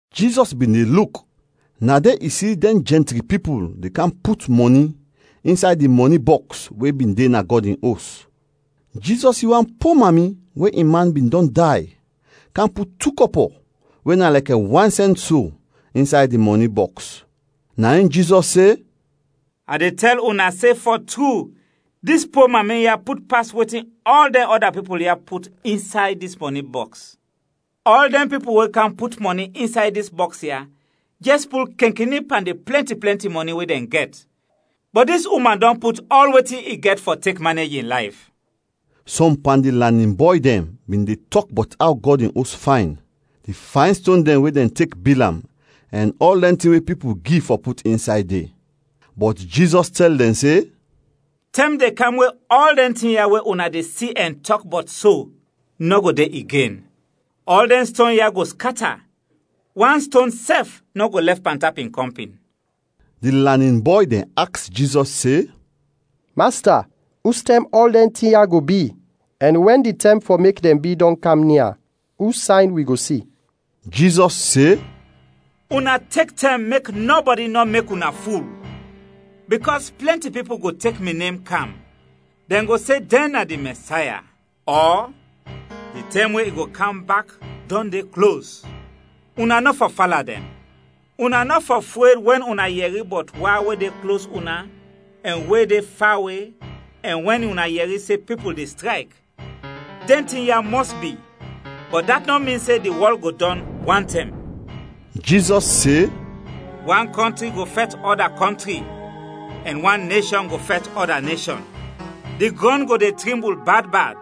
Jizɔs bin de luk, na de i si dɛn jɛntri pipul de kam put mɔni insay di mɔni bɔks we bin de na Gɔd in Os. Jizɔs si wan po mami we in man bin dɔn day, kam put tu kɔpɔ we na lɛkɛ wan sɛnt so insay di mɔni bɔks. Na in Jizɔs se, “A de tɛl una se, fɔ tru, dis po mami ya put pas wetin ɔl dɛn ɔda pipul ya put insay dis mɔni bɔks. Ɔl dɛn pipul we kam put mɔni insay dis bɔks ya jɛs pul kenkeni pan di plɛnti plɛnti mɔni we dɛn gɛt, bɔt dis uman dɔn put ɔl wetin i gɛt fɔ tek manej in layf.” Sɔm pan di lanin bɔy dɛn bin de tɔk bɔt aw Gɔd in Os fayn, di fayn ston dɛn we dɛn tek bil am, ɛn ɔl dɛn tin we pipul gi fɔ put insay de. Bɔt Jizɔs tɛl dɛn se, “Tɛm de kam we ɔl dɛn tin ya we una de si ɛn tɔk bɔt so nɔ go de igen. Ɔl dɛn ston ya go skata, wan ston sɛf nɔ go lɛf pantap in kɔmpin.” Di lanin bɔy dɛn aks Jizɔs se, “Masta, ustɛm ɔl dɛn tin ya go bi ɛn wɛn di tɛm fɔ mek dɛn bi dɔn de kam nia, us sayn wi go si?” Jizɔs se, “Una tek tɛm mek nɔbɔdi nɔ mek una ful bikɔs plɛnti pipul go tek mi nem kam, dɛn go se dɛn na di Mɛsaya ɔ di tɛm we i go kam bak dɔn de klos. Una nɔ fɔ fala dɛn. Una nɔ fɔ fred wɛn una yɛri bɔt wa we de klos una ɛn we de fawe ɛn wɛn una yɛri se pipul de strayk; dɛn tin ya mɔs bi, bɔt dat nɔ min se di wɔl go dɔn wantɛm.” Jizɔs se, “Wan kɔntri go fɛt ɔda kɔntri ɛn wan neshɔn go fɛt ɔda neshɔn. Di grɔn go de trimbul bad, bad,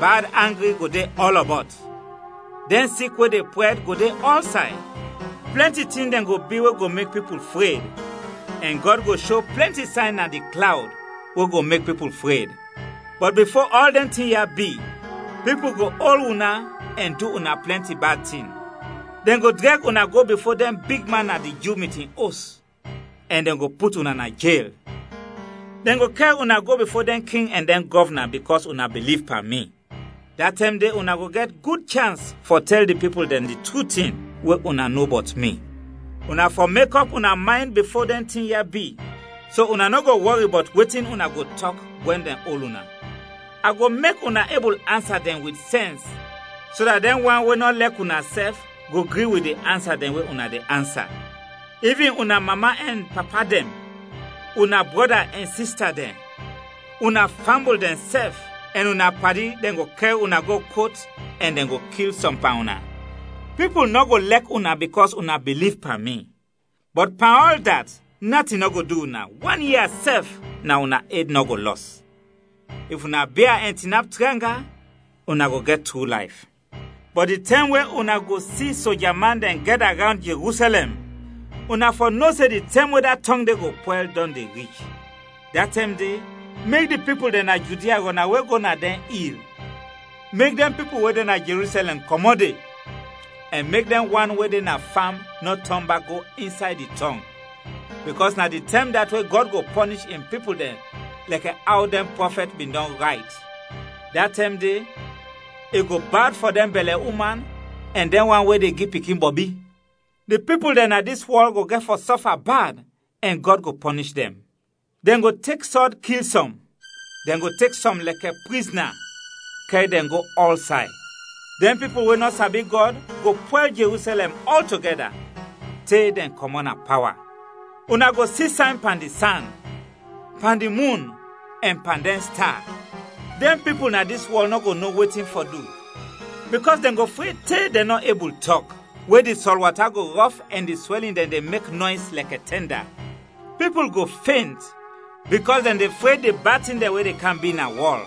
bad angri go de ɔlɔbɔt, dɛn sik we de prɛd go de ɔlsay, plɛnti tin dɛn go bi we go mek pipul fred, ɛn Gɔd go sho plɛnti sayn na di klawd we go mek pipul fred. Bɔt bifo ɔl dɛn tin ya bi, pipul go ol una ɛn du una plɛnti bad tin. Dɛn go drɛg una go bifo dɛn bigman na di Ju mitin os ɛn dɛn go put una na jel. Dɛn go kɛr una go bifo dɛn king ɛn dɛn gɔvna bikɔs una biliv pan mi. Da tɛm de una go gɛt gud chans fɔ tɛl di pipul dɛn di tru tin we una no bɔt mi. Una fɔ mekɔp una maynd bifo dɛn tin ya bi so una nɔ go wɔri bɔt wetin una go tɔk wɛn dɛn ol una. A go mek una ebul ansa dɛn wit sɛns so dat dɛn wan we nɔ lɛk una sɛf go gri wit di ansa dɛn we una de ansa. Ivin una mama ɛn papa dɛn, una brɔda ɛn sista dɛn, una fambul dɛn sɛf ɛn una padi dɛn go kɛr una go kot ɛn dɛn go kil sɔm pan una. Pipul nɔ go lɛk una bikɔs una biliv pan mi. Bɔt pan ɔl dat, natin nɔ go du una, wan ia sɛf na una ed nɔ go lɔs. If una bia ɛn tinap tranga, una go gɛt tru layf. “Bɔt di tɛm we una go si soja man dɛn gɛda rawnd Jerusɛlɛm, una fɔ no se di tɛm we da tɔng de go pwɛl dɔn de rich. Da tɛm de, mek di pipul dɛn na Judia rɔnawe go na dɛn il, mek dɛn pipul we de na Jerusɛlɛm kɔmɔt de, ɛn mek dɛn wan we de na fam nɔ tɔn bak go insay di tɔng; bikɔs na di tɛm dat we Gɔd go pɔnish in pipul dɛn lɛkɛ aw dɛn prɔfɛt bin dɔn rayt. Da tɛm de, i go bad fɔ dɛn bɛlɛ-uman ɛn dɛn wan we de gi pikin bɔbi! Di pipul dɛn na dis wɔl go gɛt fɔ sɔfa bad ɛn Gɔd go pɔnish dɛn. Dɛn go tek sɔd kil sɔm, dɛn go tek sɔm lɛkɛ prizna kɛr dɛn go ɔlsay. Dɛn pipul we nɔ sabi Gɔd, go pwɛl Jerusɛlɛm ɔltogɛda, te dɛn kɔmɔt na pawa. “Una go si sayn pan di san, pan di mun, ɛn pan dɛn sta. Dɛn pipul na dis wɔl nɔ go no wetin fɔ du bikɔs dɛn go fred te dɛn nɔ ebul tɔk we di sɔl wata go rɔf ɛn di swɛlin dɛn de mek nɔys lɛkɛ tɛnda. Pipul go fent bikɔs dɛn de fred di bad tin dɛn we de kam bi na wɔl,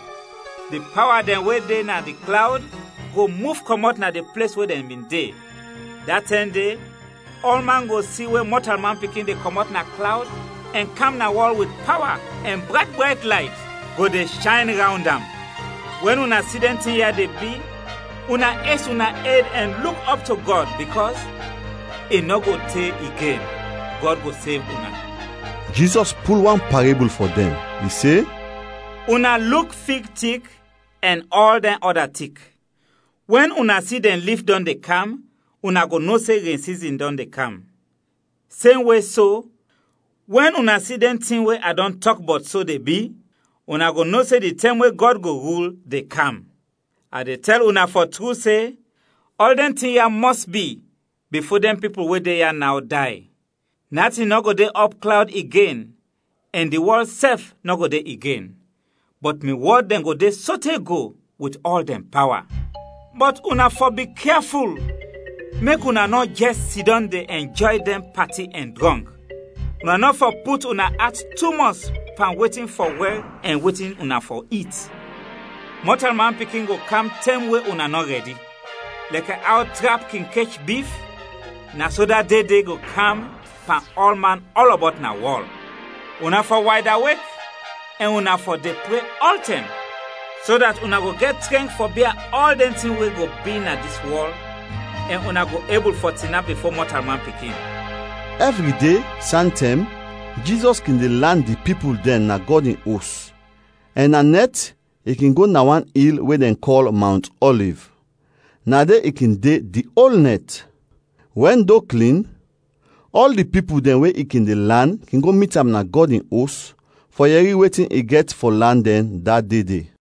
di pawa dɛn we de na di klawd go muf kɔmɔt na di ples we dɛn bin de. Da tɛm de, ɔlman go si we Mɔtalman Pikin de kɔmɔt na klawd ɛn kam na wɔl wit pawa ɛn brayt brayt layt go de shayn rawnd am. Wɛn una si dɛn tin ya de bi, una es una ed ɛn luk ɔp to Gɔd bikɔs i nɔ go te igen, Gɔd go sev una.” Jizɔs pul wan parebul fɔ dɛn. I se: “Una luk fig tik ɛn ɔl dɛn ɔda tik. Wɛn una si dɛn lif dɔn de kam, una go no se ren sizin dɔn de kam. Semwe so, wɛn una si dɛn tin we a dɔn tɔk bɔt so de bi, una go no se di tɛm we Gɔd go rul, de kam. “A de tɛl una fɔ tru se, ɔl dɛn tin ya mɔs bi, bifo dɛn pipul we de ya naw, day. Natin nɔ go de ɔpklawd igen ɛn di wɔl sɛf nɔ go de igen, bɔt mi wɔd dɛn go de sote go wit ɔl dɛn pawa. “Bɔt una fɔ bikyaful, mek una nɔ jɛs sidɔm de ɛnjɔy dɛn pati ɛn drɔnk. Una nɔ fɔ put una at tumɔs pan wetin fɔ wɛr ɛn wetin una fɔ it. Mɔtalman Pikin go kam tɛm we una nɔ rɛdi. Lɛkɛ aw trap kin kech bif, na so da de de go kam pan ɔlman ɔlɔbɔt na wɔl. Una fɔ waydawek ɛn una fɔ de pre ɔltɛm so dat una go gɛt trɛnk fɔ bia ɔl dɛn tin we go bi na dis wɔl ɛn una go ebul fɔ tinap bifo Mɔtalman Pikin.” Ɛvri de, santɛm, Jizɔs kin de lan di pipul dɛn na Gɔd in Os, ɛn na nɛt i kin go na wan il we dɛn kɔl Mawnt Ɔliv, na de i kin de di ol nɛt. Wɛn do klin, ɔl di pipul dɛn we i kin de lan kin go mit am na Gɔd in Os fɔ yɛri wetin i gɛt fɔ lan dɛn da de de.